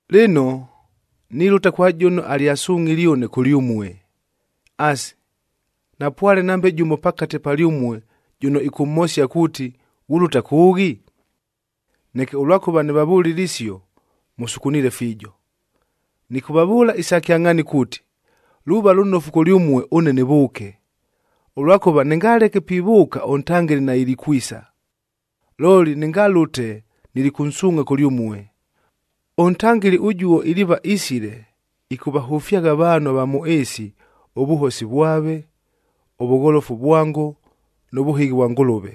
“Lɨno, nilʉta kwa jʉno alyasungʼhile ʉne kʉlyʉmue. Asi, napwale nambe jʉmo pakate palyʉmue jʉno ɨkʉmhosia kuuti, ‘Ghulʉta kʉʉghi?’ Neke ʉlwakʉva nɨvavʉlile isio, mʉsukuniile fiijo. “Nɨkʉvavʉʉla isa kyangʼhaani kuuti, luuva lʉnofu kʉlyʉmue ʉne nɨvʉʉke, ʉlwakʉva nɨngaleke pivʉʉka ʉNtangɨli nailikwisa. Looli nɨngalʉte, nilikʉnsuungʼha kʉlyʉmue. ɄNtangɨli ʉjuo iliiva isile, ɨkʉvahʉfyagha avaanhu ava mʉ ɨɨsi ʉvʉhosi vwave, ʉvʉgholofu vwango nʉ vʉhɨghi vwa Ngʉlʉve.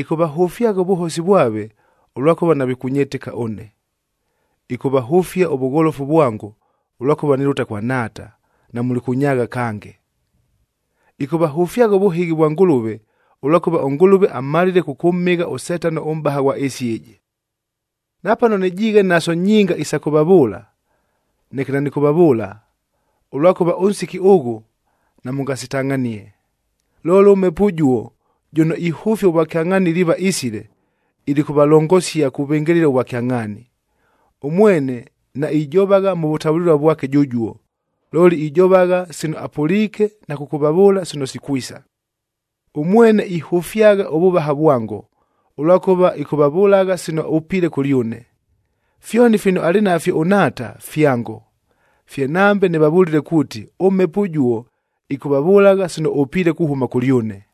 Ɨkʉvahʉfyagha ʉvʉhosi vwave, ʉlwakʉva navikʉnyɨtɨka ʉne. Ɨkʉvahʉfia ʉvʉgholofu vwango, ʉlwakʉva nilʉta kwa Nhaata, namulikʉnyaagha kange. Ɨkʉvahʉfyagha ʉvʉhɨghi vwa Ngʉlʉve, ʉlwakʉva ʉNgʉlʉve amalile kʉkʉmhɨgha ʉSetano ʉmʼbaha ghwa ɨɨsi ɨjɨ. “Napano nɨjiighe naso nyinga isa kʉvavʉʉla, neke nanɨkʉvavʉʉla, ʉlwakʉva ʉnsiki ʉghʉ namʉngasitangʼhanie. Looli ʉMhepo ʉjuo jʉno ihʉfia ʉvwakyangʼhaani iliiva isile, ilikʉvalongosia kuvɨngɨlɨla ʉvwakyangʼhaani. Ʉmwene naijovagha mʉ vʉtavʉlɨlua vwake jʉjuo, looli ijovagha sino apʉliike na kʉkʉvavʉʉla sino sikwisa. Ʉmwene ihʉfyagha ʉvʉvaha vwango, ʉlwakʉva ɨkʉvavʉlagha sino ʉpiile kʉlyʉne. Fyoni fino alɨ nafyo ʉNhaata, fyango. Fye nambe nɨvavʉlile kuuti, ʉMhepo ʉjuo ɨkʉvavʉlagha sino ʉpiile kuhʉma kʉlyʉne.”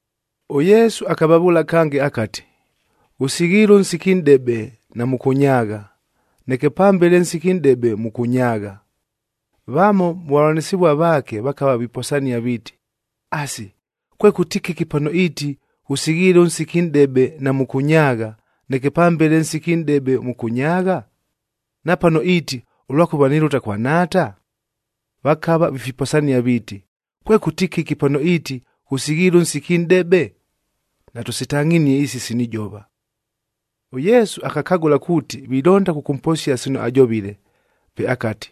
ɄYesu akavavʉʉla kange akati, “Ghʉsighiile ʉnsiki nʼdebe namʉkʉnyaagha, neke pambele ʉnsiki nʼdebe mʉkʉnyaagha.” Vamo mʉ vavʉlanɨsɨvua vaake vakava viposania viiti, “Asi, kwekʉti kɨki pano iiti, ‘Ghʉsighiile ʉnsiki nʼdebe namʉkʉnyaagha, neke pambele ʉnsiki nʼdebe mʉkʉnyaagha’? Na pano iiti, ‘Ʉlwakʉva nilʉta kwa Nhaata’?” Vakava vifiposania viiti, “Kwekʉti kɨki pano iiti, ‘Ghʉsighiile ʉnsiki nʼdebe’? Natʉsitangʼhinie isi sino ijova.” ɄYesu akakagʉla kuuti vilonda kʉkʉmposia sino ajovile, pe akati,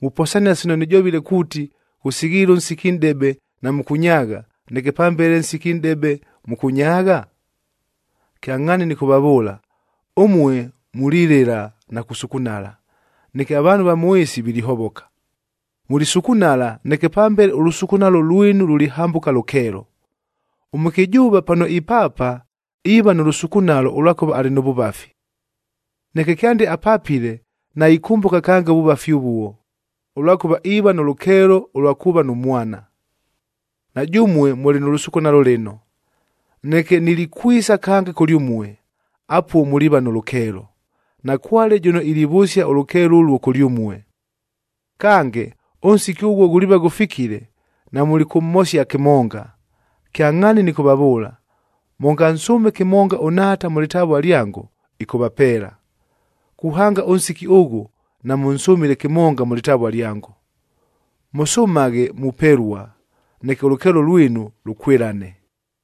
“Muposania sino nɨjovile kuuti, ‘Ghʉsighiile ʉnsiki nʼdebe namʉkʉnyaagha, neke pambele ʉnsiki nʼdebe mʉkʉnyaagha’? Kyangʼhaani nɨkʉvavʉʉla, ʉmue mulilɨla na kusukunala, neke avaanhu ava mʉ ɨɨsi vilihovoka. Mulisukunala, neke pambele ʉlʉsukunalo lwinu lulihambʉka lʉkeelo. Ʉmʉkɨjʉʉva pano ipaapa, iiva nʉ lʉsukunalo ʉlwakʉva alɨ nʉ vʉvafi. Neke kyande apapile, naikʉmbʉka kange ʉvʉvafi ʉvuo, ʉlwakʉva iiva nʉ lʉkeelo ʉlwa kuuva nʉ mwana. Na jʉmue mʉlɨ nʉ lʉsukunalo lɨno, neke nilikwisa kange kʉlyʉmue, apuo muliiva nʉ lʉkeelo. Nakwale jʉno ilivʉsia ʉlʉkeelo ʉluo kʉlyʉmue. “Kange, ʉnsiki ʉghuo ghuliiva ghʉfikile, namulikʉmhosia kɨmonga. Kyangʼhaani nɨkʉvavʉʉla, mʉngansʉʉme kɨmonga ʉNhaata mʉ lɨtavua lyango, ɨkʉvapeela. Kuhanga ʉnsiki ʉghʉ namʉnsʉmile kɨmonga mʉ lɨtavua lyango. Mʉsʉmaghe mupelua, neke ʉlʉkeelo lwinu lʉkwɨlane.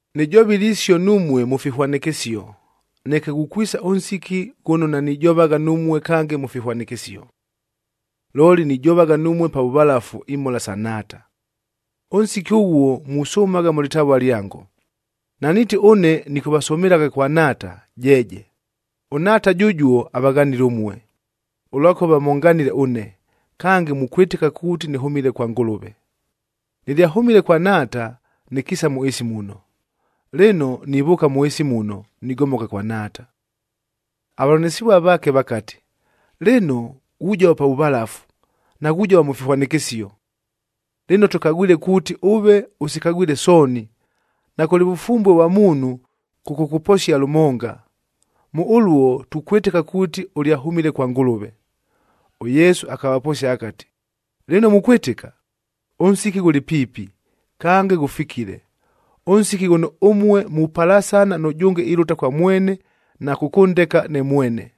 “Nɨjovile isio numue mʉ fihwanɨkɨsio, neke ghukwisa ʉnsiki ghʉno nanijovagha numue kange mʉ fihwanɨkɨsio. Looli nijovagha numue pa vʉvalafu imhola sa Nhaata. Ʉnsiki ʉghuo musʉmagha mʉ lɨtavua lyango. Naniiti ʉne nɨkʉvasʉmɨlagha kwa Nhaata, jeeje! ɄNhaata jʉjuo avaghanile ʉmue, ʉlwakʉva mʉnganile ʉne, kange mukwɨtɨka kuuti nɨhʉmile kwa Ngʉlʉve. Nɨlyahʉmile kwa Nhaata, nɨkiisa mʉ ɨɨsi muno. Lɨno, nivʉʉka mʉ ɨɨsi muno, nigomoka kwa Nhaata.” Avavʉlanɨsɨvua vaake vakati, “Lɨno, ghujova pa vʉvalafu, naghujova mʉ fihwanɨkɨsio. Lɨno tʉkagwile kuuti, ʉve ʉsikagwile sooni, nakʉlɨ vʉfumbue vwa muunhu kʉkʉkʉposia lʉmonga. Mʉ ʉluo tukwɨtɨka kuuti ʉlyahʉmile kwa Ngʉlʉve.” ɄYesu akavaposia akati, “Lɨno mukwɨtɨka? Ʉnsiki ghʉlɨ piipi, kange ghʉfikile, ʉnsiki ghʉno ʉmue mupalasana nʉjʉnge ilʉta kwa mwene na kʉkʉndeka ne mwene.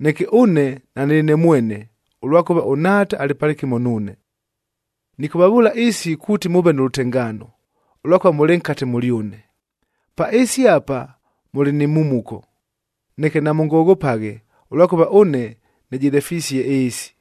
Neke ʉne nanɨlɨ ne mwene, ʉlwakʉva ʉNhaata alɨ palɨkɨmo nuune. Nɨkʉvavʉʉla isi kuuti mʉʉve nʉ lʉtengaano, ʉlwakʉva mʉlɨ nkate mʉlyʉne. Pa ɨɨsi apa mʉlɨ ni mhumuko, neke namʉngoghopaghe ʉlwakʉva ʉne nɨjɨlefisie ɨɨsi.”